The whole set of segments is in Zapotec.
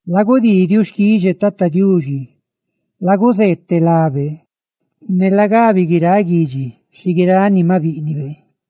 ¡Lagudii diuxquixe Tata Diuxi! ¡Laguzeeteꞌ lábe! Ne lagabi guiráꞌ guidxi xi guiráꞌ ni maꞌ bíꞌnibe.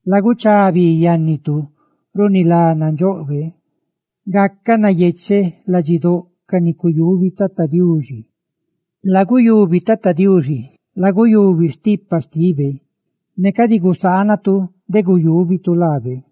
Laguchá bi yánnitu runi lá nandxoꞌbe. ¡Gacaꞌ nayecheꞌ ladxidóꞌ ca ni cuyubi Tata Diuxi! Laguyubi Tata Diuxi, laguyubi stipa xtibe; ne cadi gusaanatu de guyúbitu laabe.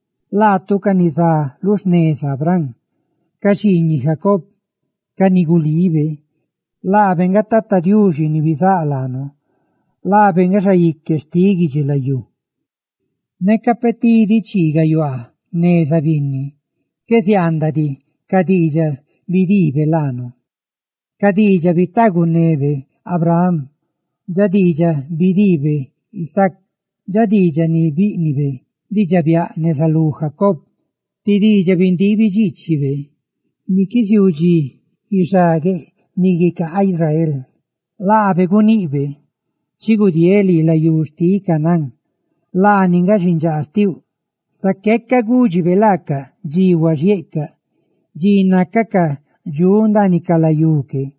laatu, ca ni zá lu xneza Abraham; laatu, ca xiiñiꞌ Jacob, ca ni gulibe. Laabe nga Tata Diuxi, ni bizáꞌ laanu; ¡laabe nga xaique xtiꞌ guidxilayú! Neca peꞌ tidi chii gayuaa neza binni qué ziaandaꞌ diꞌ ca diidxaꞌ bidiibe laanu, dxa diidxaꞌ bitaagunebe Abraham, dxa diidxaꞌ bidiibe Isaac, dxa diidxaꞌ ni bíꞌnibe diidxaꞌ biaꞌ neza lú Jacob, ti diidxaꞌ bindiibi dxiichibe ni qué ziuu dxi guixagueꞌ ni guicaa Israel, laabe guniꞌbe: «Chi gudieeꞌ lii layú xtiꞌ Canaán laani nga xindxaa xtiuꞌ.» Zaqué gúdxibe laacaꞌ dxi huaxhieꞌcaꞌ, dxi nácacaꞌ dxuꞌ ndaaniꞌ ca layú que,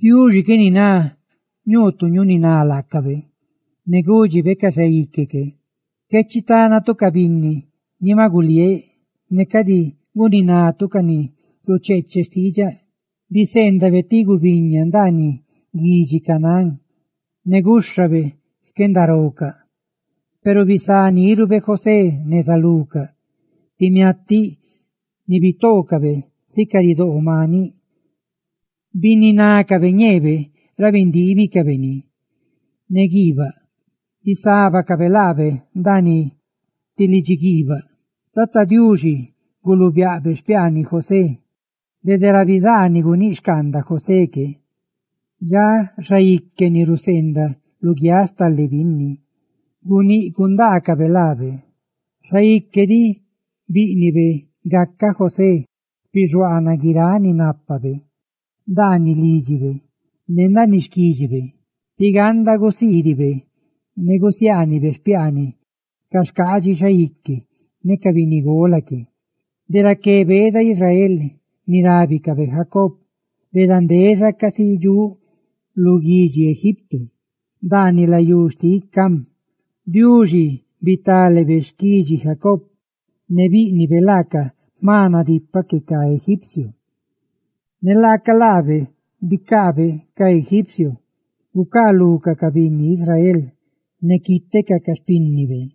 Diuxi qué niná ñuu tu ñuniná laacabe, ne gúdxibe ca xaique que: «Qué chitánatu ca binni ni maꞌ guliéꞌ, ne cadi guninatu ca ni rucheeche xtiidxaꞌ.» Biseendabe ti gubiña ndaaniꞌ guidxi Canaán, ne gúxhabe xquendarocaꞌ. Huaxa bisá nírube José neza lucaꞌ, ti miatiꞌ ni bitoocabe sica ridoo maniꞌ. Bininácabe ñeebe ra bindiibicabe ni ne guiibaꞌ; ¡bisábacabe laabe ndaaniꞌ lidxiguiibaꞌ! Tata Diuxi guluubiaꞌ xpiaaniꞌ José, dede ra bizaa ni guníꞌ xcaanda José que. Dxa xaique ni raca ni ná luguiáꞌ stale binni, guníꞌ gundaacabe laabe; xaique diꞌ bíꞌnibe gacaꞌ José xpixuaanaꞌ guiráꞌ ni nápabe ndaaniꞌ lídxibe ne ndaaniꞌ xquídxibe, tí ganda gusiidibe ne gusiaanibe xpiaaniꞌ ca xcaadxi xaique ne ca binnigola que. De raqué beeda Israel, ni rábicabe Jacob, beedandezabe casi dxuꞌ lu guidxi Egipto, ndaaniꞌ layú xtiꞌ Cam. Diuxi bitale xquidxi Jacob, ne bíꞌnibe laacaꞌ jma nadipaꞌ que ca egipcio. Ne laaca laabe bicaabe ca egipcio gucaalucaꞌ ca binni Israel ne quítecaꞌ ca xpínnibe.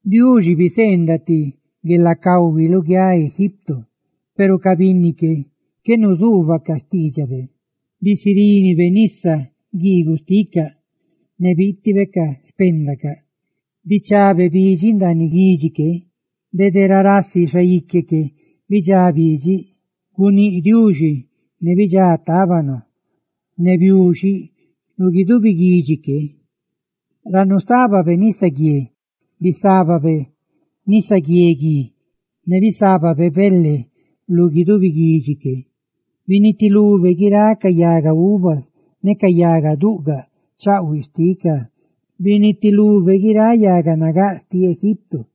Diuxi biseendaꞌ ti guelacahui luguiáꞌ Egipto, huaxa ca binni que, qué nuzuubacaꞌ xtiidxabe. Bisirínibe nisa guiiguꞌ xticaꞌ, ne biitibe ca xpéndacaꞌ; bichabe bidxiꞌ ndaaniꞌ guidxi que, dede ra rasi xaique que bidxá bidxiꞌ. Guníꞌ Diuxi, ne bidxá tábano ne biuxiꞌ lu guidubi guidxi que. Ra nusábabe nisaguié bisábabe nisaguié gui, ne bisábabe bele lu guidubi guidxi que. Binitilube guiráꞌ ca yaga uvas ne ca yaga duꞌgaꞌ chaꞌhuiꞌa xticaꞌ; ¡binitilube guiráꞌ yaga nagáꞌ xtiꞌ Egipto!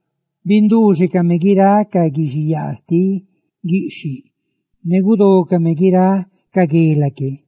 ¡Binduuxecame guiráꞌ ca guixiyaa xtiꞌ guiꞌxhiꞌ ne gudócame guiráꞌ ca guela que!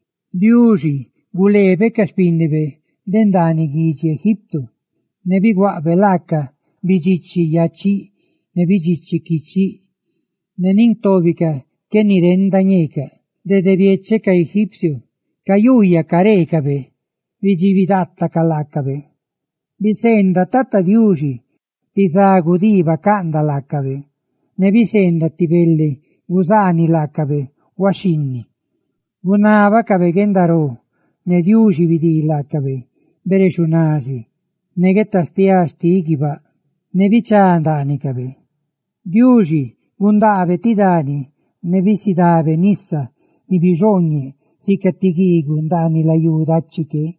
Diuxi gulee ca xpinni de ndaaniꞌ guidxi Egipto, ne biguaꞌbe laaca oro ne plata, ne nin tóbicaꞌ qué nirenda ñeecaꞌ. Dede biecheꞌ ca egipcio cayuuyacaꞌ careecabe, bidxibi daatacaꞌ laacabe. Biseendaꞌ Tata Diuxi ti za gudii bacaꞌndaꞌ laacabe, ne biseendaꞌ ti bele guzaaniꞌ laacabe huaxhinni. Gunábacabe guendaró, ne Diuxi bidii laacabe bere xunaxi, ne guetastiá xtiꞌ guibáꞌ bichá ndaanicabe. Diuxi gundaa ti dani, ne bisidá nisa ni bixooñeꞌ sica ti guiiguꞌ ndaaniꞌ layú dachi que.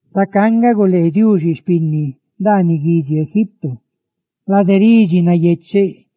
Zacá nga gulee Diuxi xpinni ndaaniꞌ guidxi Egipto, lade ridxi nayecheꞌ,